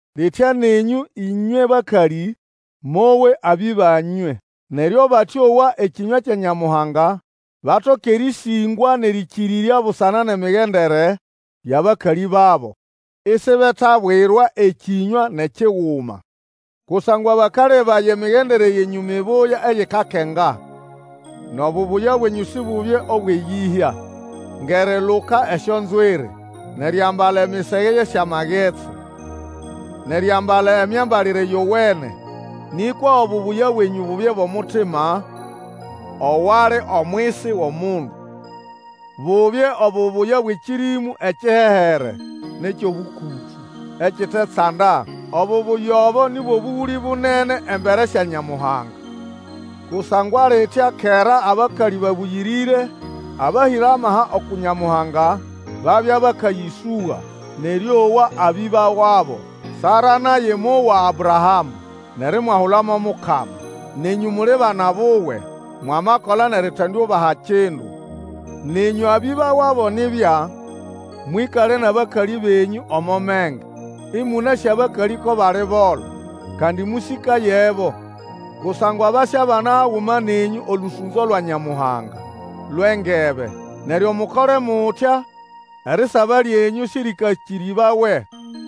Litya nenyũ ĩnywe bakalĩ, mowe abĩba nywe, neryo abatĩowa ekĩnywa kya Nyamuhanga batoke erĩsĩngwa nʼerĩkĩrĩrya busana nʼemigendere yʼabakalĩ babo, isibetabwirwa ekĩnywa nʼekiguma. Kusangwa bakalebaya emigendere yenyũ mibuya eyikakenga. Nʼobubuya bwenyũ sibubye obwʼeyĩhya, ngʼeriluka esyonzwiri, nʼeriambala emisege yʼesyamagetsi, nʼeriambala emyambalire yowene. Nĩkwa obubuya bwenyũ bubye bwʼomutima owali omwisi wʼomundu. Bubye obubuya bwʼekĩrĩmũ ekihehere nʼekyʼobũkũtũ, ekitetsanda. Obubuya obo ni bwʼobũgũlĩ bunene embere sya Nyamuhanga. Kusangwa litya kera abakalĩ babũyĩrĩre, abahĩra amaha uku Nyamuhanga, babya bakayĩsũga, nʼerĩowa abĩba wabo. Sara naye mwowa Abrahamũ, nʼerimwahula mo mukama. Nenyũ muli bana buwe mwamakola nʼeritendiubaha kindu. Nenyũ abĩba wabo nibya, mwĩkale nʼabakalĩ benyũ omo menge, ĩmũnasĩ abakalĩ ko bali bolo. Kandi mũsĩkayebo, kusangwa basyabana haguma nenyũ olũsũnzo lwa Nyamuhanga lwʼengebe, neryo mukole mutya erisaba lyenyũ sĩrĩkakĩrĩbawe.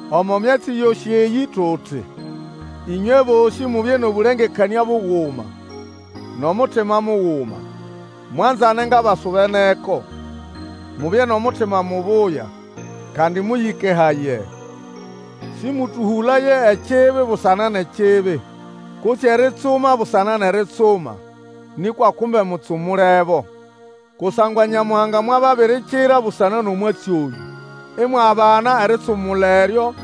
Omo myatsi yosĩ eyĩ tuti, Ĩnywe bosĩ mubye nʼobũlengekanĩa buguma, nʼomutima muguma, mwanzane ngʼabasubeneko, mubye nʼomutima mubuya, kandi mũyĩkehaye. Sĩmũtũhũlaye ekibi busana nʼekibi, kutse eritsuma busana nʼeritsuma, nĩkwa kumbe mutsumulebo. Kusangwa Nyamuhanga mwababirikira busana nʼomwatsi oyũ, imwabana eritsumula eryo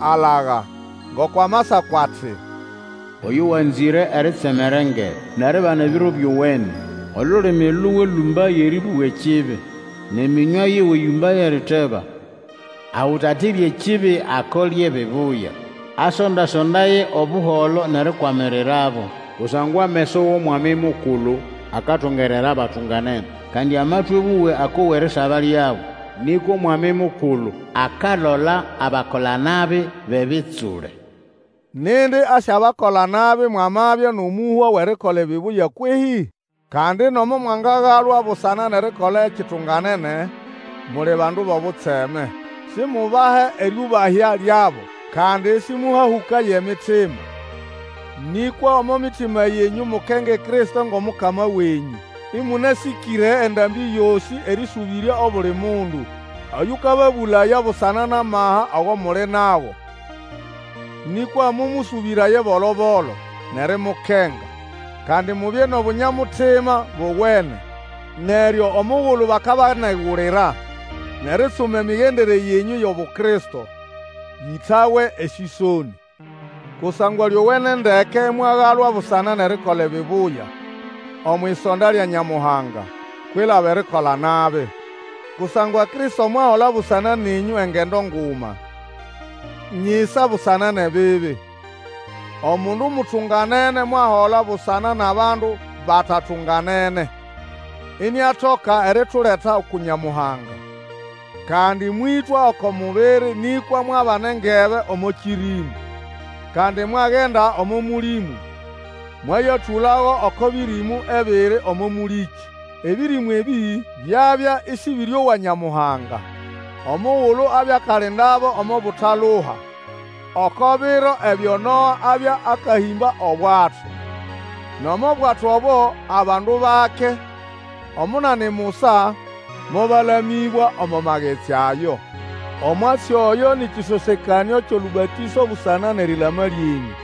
alaga. Ngoko Amasako ati, Oyo wanzĩre eritsemera engebe, nʼeribana ebiro byowene, Olulimi luwe lũmbaye erĩbũga ekibi, nʼemĩnywa yiwe yũmbaye eriteba. Ahũtatire ekibi, akole ebibuya; Asonda-sondaye Obuholo, nʼerikwamirirabo. Kusangwa ameso wʼOmwami Mukulu akatungerera abatunganene, Kandi amatwĩ wuwe akowa erisaba lyabo. Nĩkwa Omwami Mukulu akalola abakola-nabi bʼebitsule. Nindi asyabakola nabi mwamabya nʼomũhwa wʼerikola ebibuya kwehĩ? Kandi nomo mwangagalwa busana nʼerikola ekitunganene, muli bandu bʼobutseme. Simubahe erĩũbahya lyabo, kandi sĩmũhahũkaye emitima. Nĩkwa omo mitima yenyũ mukenge Kristo ngʼomukama wenyũ. Ĩmũnasĩkĩre endambĩ yosĩ erĩsũbĩrya obuli mundu oyũkababũlaya busana nʼamaha ago muli nago. Nĩkwa mũmũsũbĩraye bolo-bolo, nʼerimukenga. Kandi mubye nʼobunya-mutima bowene, neryo omugulu bakabanegulira, nʼeritsuma emigendere yenyũ yʼobu Kristo, bĩtawe esĩsonĩ. Kusangwa lyowene ndeke imwagalwa busana nʼerikola ebibuya omwʼisonda lya Nyamuhanga, kwilaba erikola nabi. Kusangwa Kristo mwahola busana nenyũ engendo nguma nyisa busana nʼebibi. Omundu mutunganene mwahola busana nʼabandu batatunganene, iniatoka erituleta uku Nyamuhanga. Kandi mwĩtwa oko mubiri nĩkwa mwabana engebe omo kĩrĩmũ. Kandi mwagenda omo mũlĩmũ, mwayatũlago oko bĩrĩmũ ebiri omo mũlĩkĩ. Ebĩrĩmũ ebĩ byabya ĩsĩbĩrĩowa Nyamuhanga, omugulu abya akalindabo omo butaluha oko biro ebyo Noa abya akahĩmba obwato. Nʼomo bwato obo abandu bake, Omunani musa, mobalamĩbwa omo magetsi ayo. Omwatsi oyo nĩ kĩsosekanĩo kyʼolũbatĩso busana nʼerilama lyenyũ.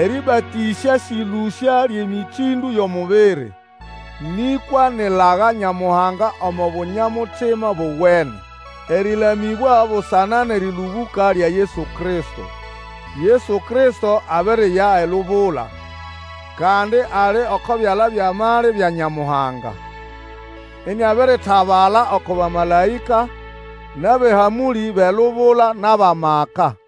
Erĩbatĩsya sĩ ʼlũsya lyʼemĩtĩndũ yʼomubiri, nĩkwa ni ʼlaga Nyamuhanga omo bunya-mutima bowene, erĩlamĩbwa busana nʼerĩlũbũka lya Yesu Kristo. Yesu Kristo abiriya elubula, kandi ali oko byala byʼamali bya Nyamuhanga; iniabiritabala oko bamalaĩka, nʼabʼehamũlĩ bʼelubula nʼabʼamaka.